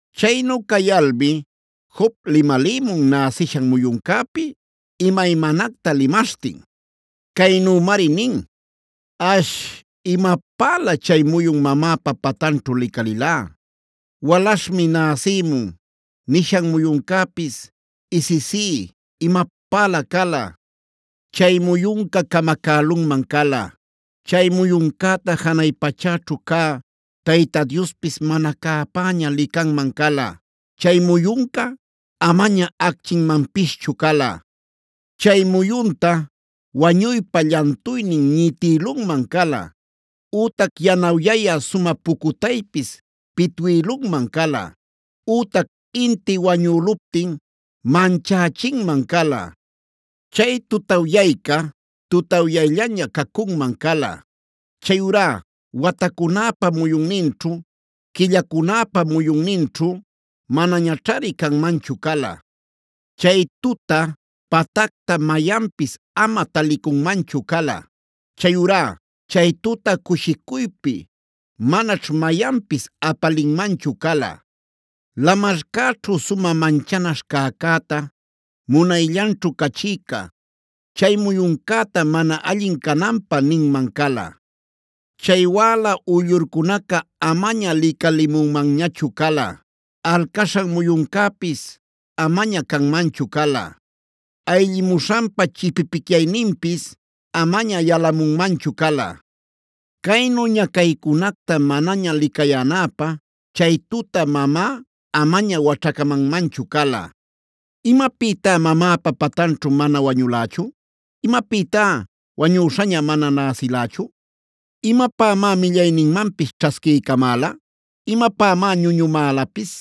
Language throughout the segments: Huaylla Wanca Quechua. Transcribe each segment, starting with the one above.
Chaynu cayalmi Job limalïmun näsishan muyuncäpi imaymanacta limaśhtin. Caynümari nin:a “Ash, imapälä chay muyun mamäpa patanćhu licalilá. ‘Walaśhmi näsïmun’ nishan muyuncäpis ¡isisí, imapälä cala! Chay muyunca camacälunman cala. Chay muyuncäta janay pachäćhu cä Tayta Diospis mana cäpäña licanman cala. Chay muyunca amaña acchinmanpischu cala. Chay muyunta wañuypa llantuynin ñitïlunman cala, ütac yanawyaya sumä pucutaypis pitwïlunman cala, ütac inti wañüluptin manchächinman cala. Chay tutawyayca tutawyayllaña cacunman cala. Chayurá watacunäpa muyunninćhu, quillacunäpa muyunninćhu manañaćhari canmanchu cala. Chay tuta, patacta mayanpis ama talicunmanchu cala. Chayurá chay tuta cushicuypi manaćh mayanpis apalinmanchu cala. Lamarcäćhu sumä manchanaśhb cäcäta, munayllanćhu cachïca, chay muyuncäta mana allin cananpä ninman cala. Chay wäla uyllurcunaca amaña licalimunmanñachu cala, alcaśhan muyuncäpis amaña canmanchu cala, ayllimuśhanpa chipipicyayninpis amaña yalamunmanchu cala. Caynu ñacaycunacta manaña licayänäpä chay tuta mamá amaña waćhacamanmanchu cala. “¿Imapïtá mamäpa patanćhu mana wañülächu? ¿Imapïtá wañüśhaña mana näsilächu? ¿Imapämá millayninmanpis ćhasquiycamäla? ¿Imapämá ñuñumälapis?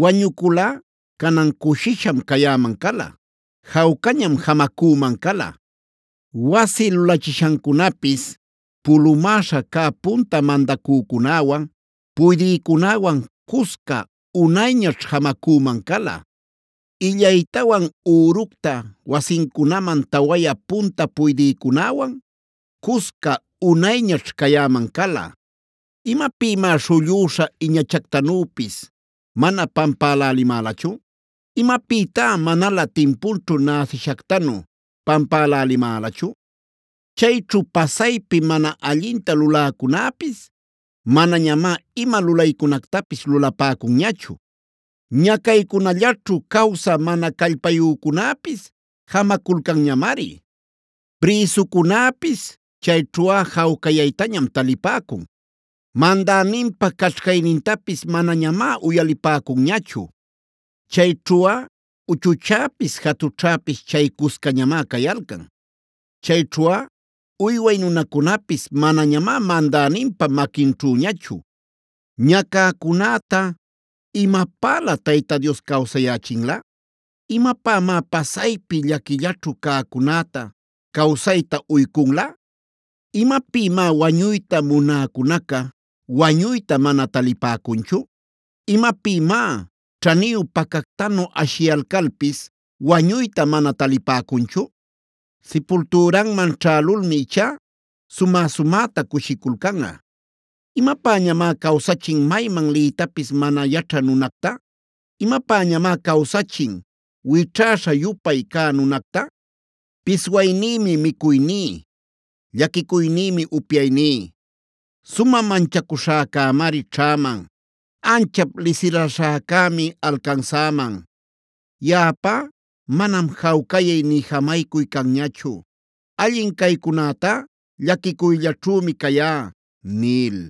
Wañuculꞌa canan cushisham cayäman cala. Jawcañam jamacüman cala. Wasi lulachiśhancunapis pulumäśha cä punta mandacücunäwan puydïcunäwan cusca unayñaćh jamacüman cala. Illaytawan üructa wasincunaman tawayä punta puydïcunäwan cusca uynayñaćh cayäman cala. ¿Imapïmá śhullüśha iñachactanüpis mana pampälälimälachu? ¿Imapïtá manalä timpunćhu näsïshactanu pampälälimälachu? Chayćhu pasaypi mana allinta luläcunäpis manañamá ima lulaycunactapis lulapäcunñachu. Ñacaycunallaćhu cawsä mana callpayücunäpis jamaculcanñamari. Prïsucunäpis chayćhuꞌa jawcayaytañam talipäcun. Mandäninpa caćhcaynintapis manañamá uyalipäcunñachu. Chayćhuꞌa uchuchäpis jatućhäpis chay cuscañamá cayalcan. Chayćhuꞌa uyway nunacunapis manañamá mandäninpa maquinćhüñachu. “Ñacäcunäta ¿imapälä Tayta Dios cawsayächinlä? ¿Imapämá pasaypi llaquillaćhu cäcunäta cawsayta uycunlä? ¿Imapïmá wañuyta munäcunaca wañuyta mana talipäcunchu?c ¿Imapïmá ćhaniyu pacactanu ashiyalcalpis wañuyta mana talipäcunchu? Sipultüranman ćhälulmi ichá sumä-sumäta cushiculcanꞌa. ¿Imapäñamá cawsachin mayman liytapis mana yaćhä nunacta? ¿Imapäñamá cawsachin wićhäśha-yupay cä nunacta? Piswaynïmi micuyní; llaquicuynïmi upyayní. Sumä manchacuśhäcämari ćhäman; anchap lisiraśhäcämi alcansäman. Yaꞌapá manam jawcayay nï jamaycuy canñachu; allin caycunätá llaquicuyllaćhümi cayá” nil.